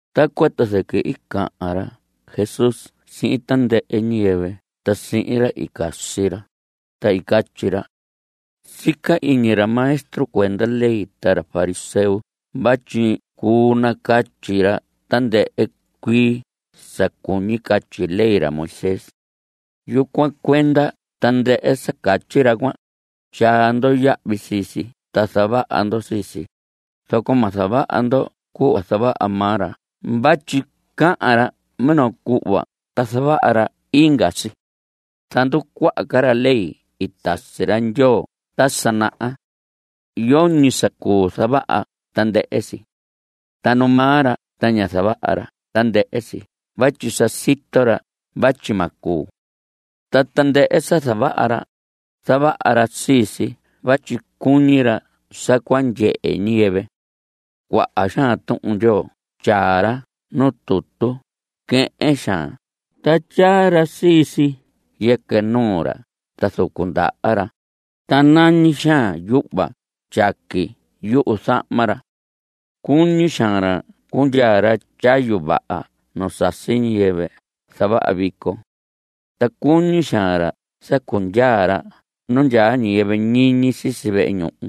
Tacuan ta zɨquɨ i cahan ra Jesús sihin tandɨhɨ ñiyɨvɨ ta sihin ra i casi ra, ta i catyi ra: Sica iñi ra maestro cuenda ley ta ra fariseo vatyi cuu nacatyi ra tandɨhɨ cuii sa cuñi catyi ley ra Moisés. Yucuan cuenda tandɨhɨ sa catyi ra cuan, tyaa ndo yahvi sii si, ta zavaha ndo sii si, zoco ma zavaha ndo cuhva zavaha maa ra vatyi cahan ra minoo cuhva ta zavaha ra inga si. Zanducuaha ca ra ley i tasi ra Ndyoo ta sa naha. Yoñi sa cuu zavaha tandɨhɨ sii. Ta nu maa ra ta ña zavaha ra tandɨhɨ si vatyi sa sito ra vatyi ma cuu. Ta tandɨhɨ sa zavaha ra, zavaha ra sii si vatyi cuñi ra sa cua ndyehe ñiyɨvɨ. Cuaha xaan Tuhun Ndyoo tyaa ra nu tutu quehen xaan ta tyaa ra sii si yɨquɨ nuu ra ta zucu ndaha ra, ta nañi xaan yuhva tyaqui yuzahma ra. Cuñi xaan ra cundyaa ra tyayu vaha nu sasi ñiyɨvɨ zavaha vico. Ta cuñi xaan ra sa cundyaa ra nu ndyaa ñiyɨvɨ ñiñi sisi vehe ñuhu.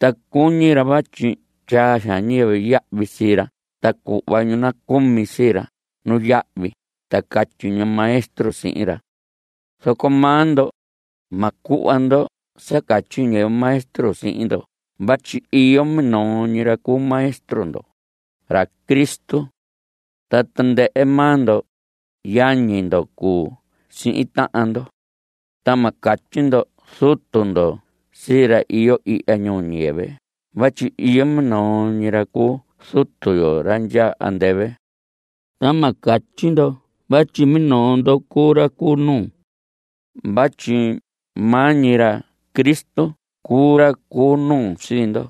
Ta cuñi ra vatyi tyaa xaan ñiyɨvɨ yahvi sii ra ta cuhva ñu nacumi sii ra nuyahvi ta catyi ñu maestro sihin ra. Zoco maa ndo, ma cuhva ndo sa catyi ñiyɨvɨ maestro sii ndo vatyi iyo minoo ñi ra cuu Maestro ndo, ra Cristo. Ta tandɨhɨ maa ndo, yañi ndo cuu sihin tahan ndo. Ta ma catyi ndo zutu ndo sii ra iyo ihya ñuu ñiyɨvɨ vatyi iyo minoo ñi ra cu Zutu yo. Ra ndyaa andɨvɨ. Ta ma catyi ndo vatyi minoo ndo cuu ra cu nuu, vatyi maa ñi ra Cristo cuu ra cu nuu sii ndo.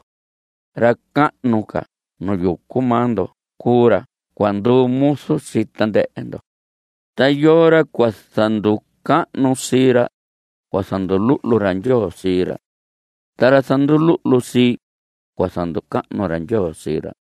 Ra cahnu ca nu yucu maa ndo cuu ra cua nduu muzu sii tandɨhɨ ndo. Ta yoo ra cua zanducahnu sii ra, cua zanduluhlu ra Ndyoo sii ra. Ta ra zanduluhlu sii, cua zanducahnu ra Ndyoo sii ra.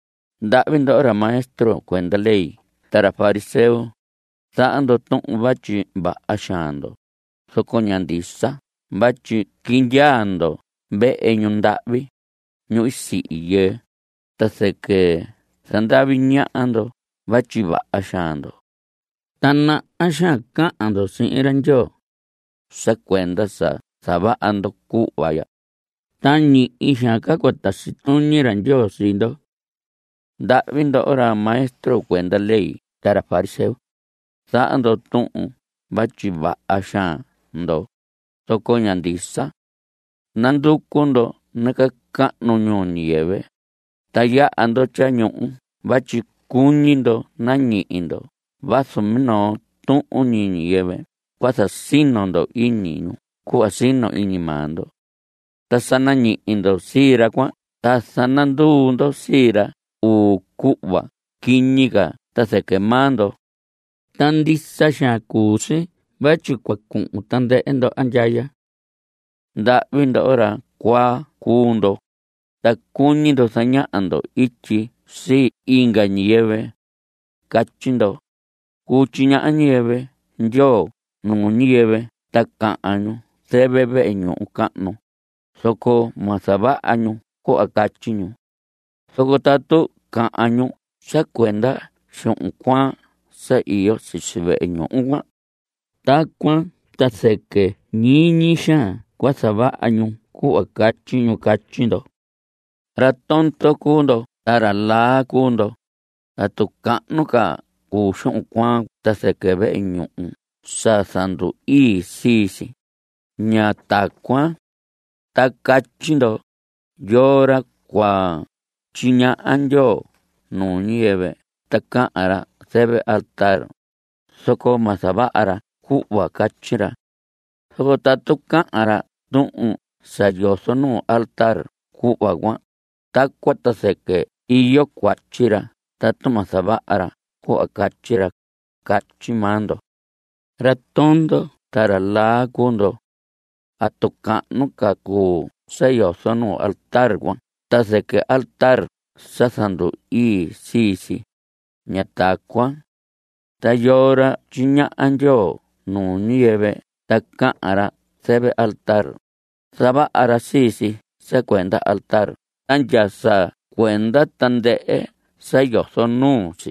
¡Ndahvi ndoho ra maestro cuenda ley ta ra fariseo! Zaha ndo tuhun vatyi vaha xaan ndo, zoco ña ndisa vatyi quindyaa ndo vehe ñundahvi, ñu sihi yɨɨ, ta zɨquɨ zandavi ñaha ndo vatyi vaha xaan ndo, ta naha xaan cahan ndo sihin ra Ndyoo. Sa cuenda sa zavaha ndo cuhva ya, ta ñihi xaan ca cua tasi tuñi ra Ndyoo sii ndo. ¡Ndahvi ndoho ra maestro cuenda ley ta fariseo! Zaha ndo tuhun vatyi vaha xaan ndo, zoco ña ndisa. Nanducu ndo nacahnu ñuu ñiyɨvɨ, ta yaha ndo tyañuhu vatyi cuñi ndo nañihi ndo vazu minoo tuhun ñi ñiyɨvɨ cua zasino ndo iñi ñu cuhva sino iñi maa ndo. Ta sa nañihi ndo sii ra cuan ta zananduu ndo sii ra uu cuhva quiñi ca ta zɨquɨ maa ndo. Ta ndisa xaan cuu si vatyi cua cuhun tandɨhɨ ndo andyaya. ¡Ndahvi ndoho! Ra cuaa cuu ndo, ta cuñi ndo zañaha ndo ityi sii inga ñiyɨvɨ. Catyi ndo: “Cuu tyiñaha ñiyɨvɨ Ndyoo nuu ñiyɨvɨ ta cahan ñu zɨvɨ vehe ñuhu cahnu, zoco ma zavaha ñu cuhva catyi ñu. Zoco tatu cahan ñu sa cuenda xuhun cuaan sa iyo sisi vehe ñuhu cuan, tacuan ta zɨquɨ ñiñi xaan cua zavaha ñu cuhva catyi ñu.” Catyi ndo. Ra tondo cuu ndo ta ra laa cuu ndo. ¿Atu cahnu ca cuu xuhun cuaan ta zɨquɨ vehe ñuhu sa zandu‑ii sii si? Ña tacuan. Ta catyi ndo: “Yoo ra cua tyiñaha Ndyoo nuu ñiyɨvɨ ta cahan ra zɨvɨ altar, zoco ma zavaha ra cuhva catyi ra. Zoco tatu cahan ra tuhun sa yozo nuu altar cuhva cuan, tacuan ta zɨquɨ iyo cuatyi ra tatu ma zavaha ra cuhva catyi ra.” Catyi maa ndo. Ra tondo ta ra laa cuu ndo. ¿Atu cahnu ca cuu sa yozo nuu altar cuan ta zɨquɨ altar sa zandu‑ii sii si? Ña tacuan. Ta yoo ra tyiñaha Ndyoo nuu ñiyɨvɨ ta cahan ra zɨvɨ altar, zavaha ra sii si sa cuenda altar ta ndya sa cuenda tandɨhɨ sa yozo nuu si.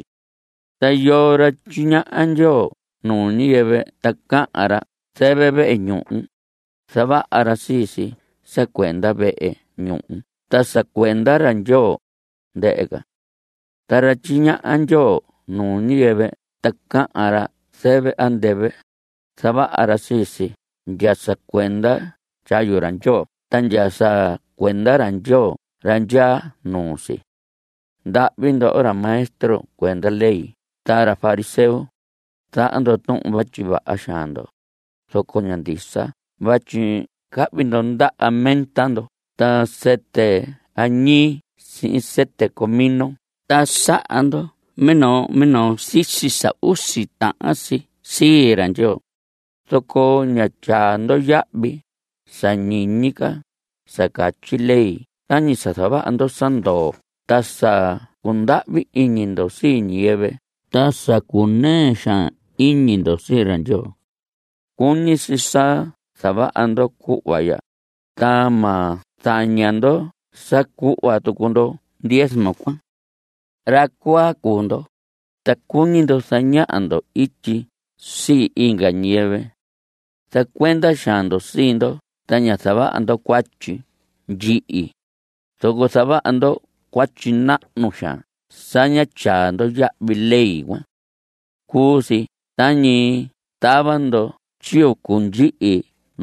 Ta yoo ra tyiñaha Ndyoo nuu ñiyɨvɨ ta cahan ra zɨvɨ vehe ñuhu, zavaha ra sii si sa cuenda vehe ñuhu ta sa cuenda ra Ndyoo, ndɨhɨ ca. Ta ra tyiñaha Ndyoo nuu ñiyɨvɨ ta cahan ra zɨvɨ andɨvɨ, zavaha ra sii si ndya sa cuenda tyayu ra Ndyoo ta ndya sa cuenda ra Ndyoo ra ndyaa nuu si. ¡Ndahvi ndoho ra maestro cuenda ley ta ra fariseo! Zaha ndo tuhun vatyi vaha xaan ndo, zoco ña ndisa vatyi cahvi ndo ndaha menta ndo ta sɨtɨ anís sihin sɨtɨ comino ta saha ndo minoo minoo sisi sa usi tahan si sii ra Ndyoo, zoco ña tyaa ndo yahvi sa ñiñi ca sa catyi ley tañi sa zavaha ndo sa ndoo ta sa cundahvi iñi ndo sii ñiyɨvɨ ta sa cunɨɨ xaan iñi ndo sii ra Ndyoo. Cuñi si sa zavaha ndo cuhva ya, ta ma zaña ndo sa cuhva tucu ndo diezmo cuan. Ra cuaa cuu ndo, ta cuñi ndo zañaha ndo ityi sii inga ñiyɨvɨ. Zacuenda xaan ndo sii ndo ta ña zavaha ndo cuatyi ndyihi, zoco zavaha ndo cuatyi nahnu xaan sa ña tyaa ndo yahvi ley cuan. Cuu si tañi tava ndo tyiyucu ndyihi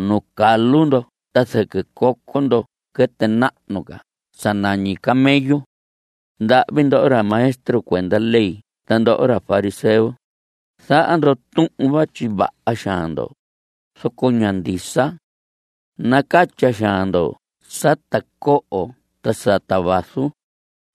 nuu calu ndo ta zɨquɨ coco ndo quɨtɨ nahnu ca sa nañi camello. ¡Ndahvi ndoho ra maestro cuenda ley ta ndoho ra fariseo! Zaha ndo tuhun vatyi vaha xaan ndo, zoco ña ndisa. Nacatya xaan ndo sata coho ta sata vaso,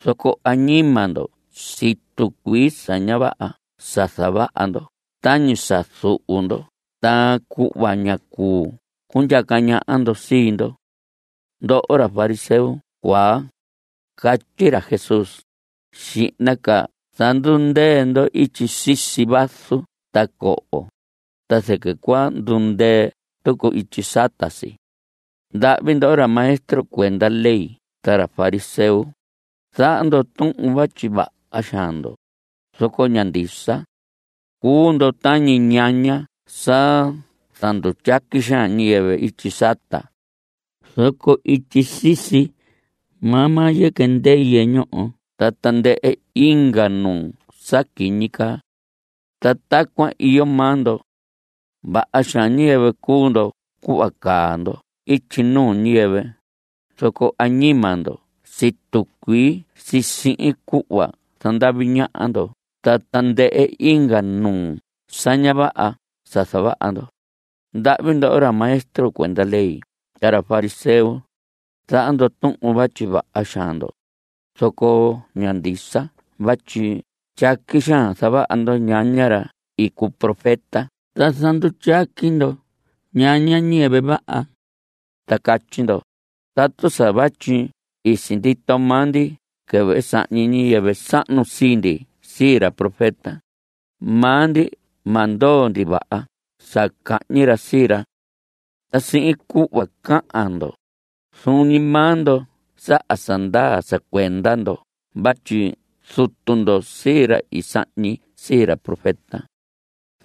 zoco añima ndo situ cuii sa ña vaha sa zavaha ndo tañi sa zuhu ndo ta cuhva ña cuu cundyaca ñaha ndo sii ndo. Ndoho ra fariseo cuaa, catyi ra Jesús, xihna ca zandundɨun ityi sisi vaso ta coho, ta zɨquɨ cua ndundɨɨ tucu ityi sata si. ¡Ndahvi ndoho ra maestro cuenda ley ta ra fariseo! Zaha ndo tuhun vatyi vaha xaan ndo, zoco ña ndisa. Cuu ndo tañi ñaña sa zandutyaqui xaan ñiyɨvɨ ityi sata, zoco ityi sisi maa maa yɨquɨ ndɨyɨ ñoho ta tandɨhɨ inga nuu sa quiñi caa. Ta tacuan iyo maa ndo. Vaha xaan ñiyɨvɨ cuu ndo cuhva caa ndo ityi nuu ñiyɨvɨ, zoco añima ndo situ cuii si sihin cuhva zandavi ñaha ndo ta tandɨhɨ inga nuu sa ña vaha sa zavaha ndo. ¡Ndahvi ndoho ra maestro cuenda ley ta ra fariseo! Zaha ndo tuhun vatyi vaha xaan ndo, zoco ña ndisa vatyi tyaqui zavaha ndo ñaña ra i cuu profeta ta zandutyaqui ndo ñaña ñiyɨvɨ vaha. Ta catyi ndo: “Tatu sa vatyi i sindito maa ndi quɨvɨ i sahñi ñiyɨvɨ sahnu sii ndi sii ra profeta, maa ndi ma ndoo ndi vaha sa cahñi ra sii ra.” Ta sihin cuhva cahan ndo, zuun ñi maa ndo saha sa ndaa sa cuenda ndo vatyi zutu ndo sii ra i sahñi sii ra profeta.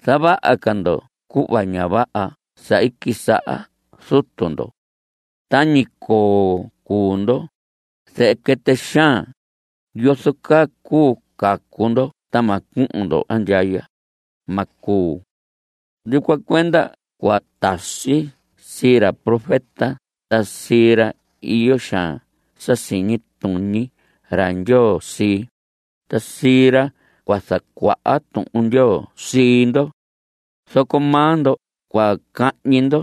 ¡Zavaha ca ndo cuhva ña vaha sa i quisaha zutu ndo! ¡Tañi coo cuu ndo, zehe quɨtɨ xaan! ¿Yozo caa cuu cacu ndo ta ma cuhun ndo andyaya? Ma cuu. Yucuan cuenda cua tasi sii ra profeta ta sii ra iyo xaan sa siñi tuñi ra Ndyoo sii, ta sii ra cua zacuaha Tuhun Ndyoo sii ndo. Zoco maa ndo cua cahñi ndo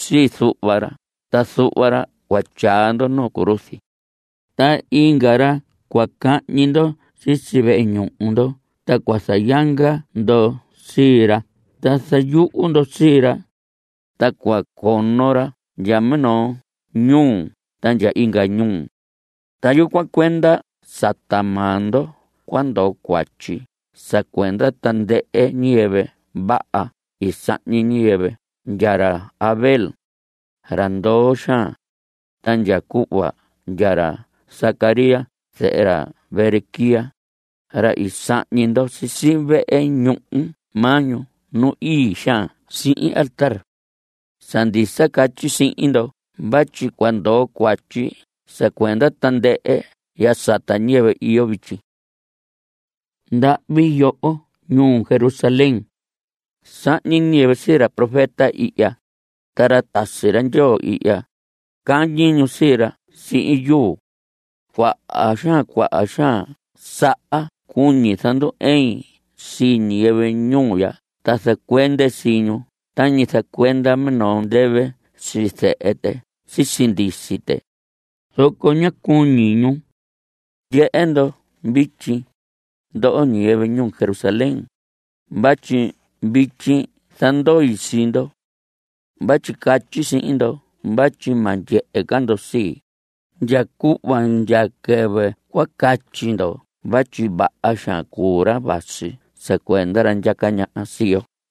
sii zuhva ra ta zuhva ra cua tyaa ndo nuu cruz. Ta inga ra cua cañi ndo sisi vehe ñuhu ndo ta cua zayanga ndo sii ra ta zayuhu ndo sii ra, ta cua cono ra ndya minoo ñuu ta ndya inga ñuu. Ta yucuan cuenda sata maa ndo cua ndoo cuatyi sa cuenda tandɨhɨ ñiyɨvɨ vaha i sahñi ñiyɨvɨ ndya ra Abel, ra ndoo xaan, ta ndya cuhva ndya ra Zacarías zehe ra Berequías, ra i sahñi ndo sisi vehe ñuhu mahñu nu ii xaan sihin altar. Sa ndisa catyi sihin ndo vatyi cua ndoo cuatyi sa cuenda tandɨhɨ ya sata ñiyɨvɨ iyo vityi. ¡Ndahvi yoho ñuu Jerusalén! Sahñi ñiyɨvɨ sii ra profeta ihya, ta ra tasi ra Ndyoo ihya, cañi ñu sii ra sihin yuu. ¡Cuaha xaan cuaha xaan saha cuñi zandu‑ɨin sii ñiyɨvɨ ñuu ya ta zacuende sii ñu tañi zacuenda minoo ndɨvɨ sii zehe tɨ sisi ndisi tɨ, zoco ña cuñi ñu! Ndyehe ndo vityi, ndoho ñiyɨvɨ ñuu Jerusalén, vatyi vityi zandoi sii ndo. Vatyi catyi sihin ndo vatyi ma ndyehe ca ndo sii, ndya cuhva ndya quɨvɨ cua catyi ndo vatyi vaha xaan cuu ra vasi sa cuenda ra ndyaca ñaha sii yo.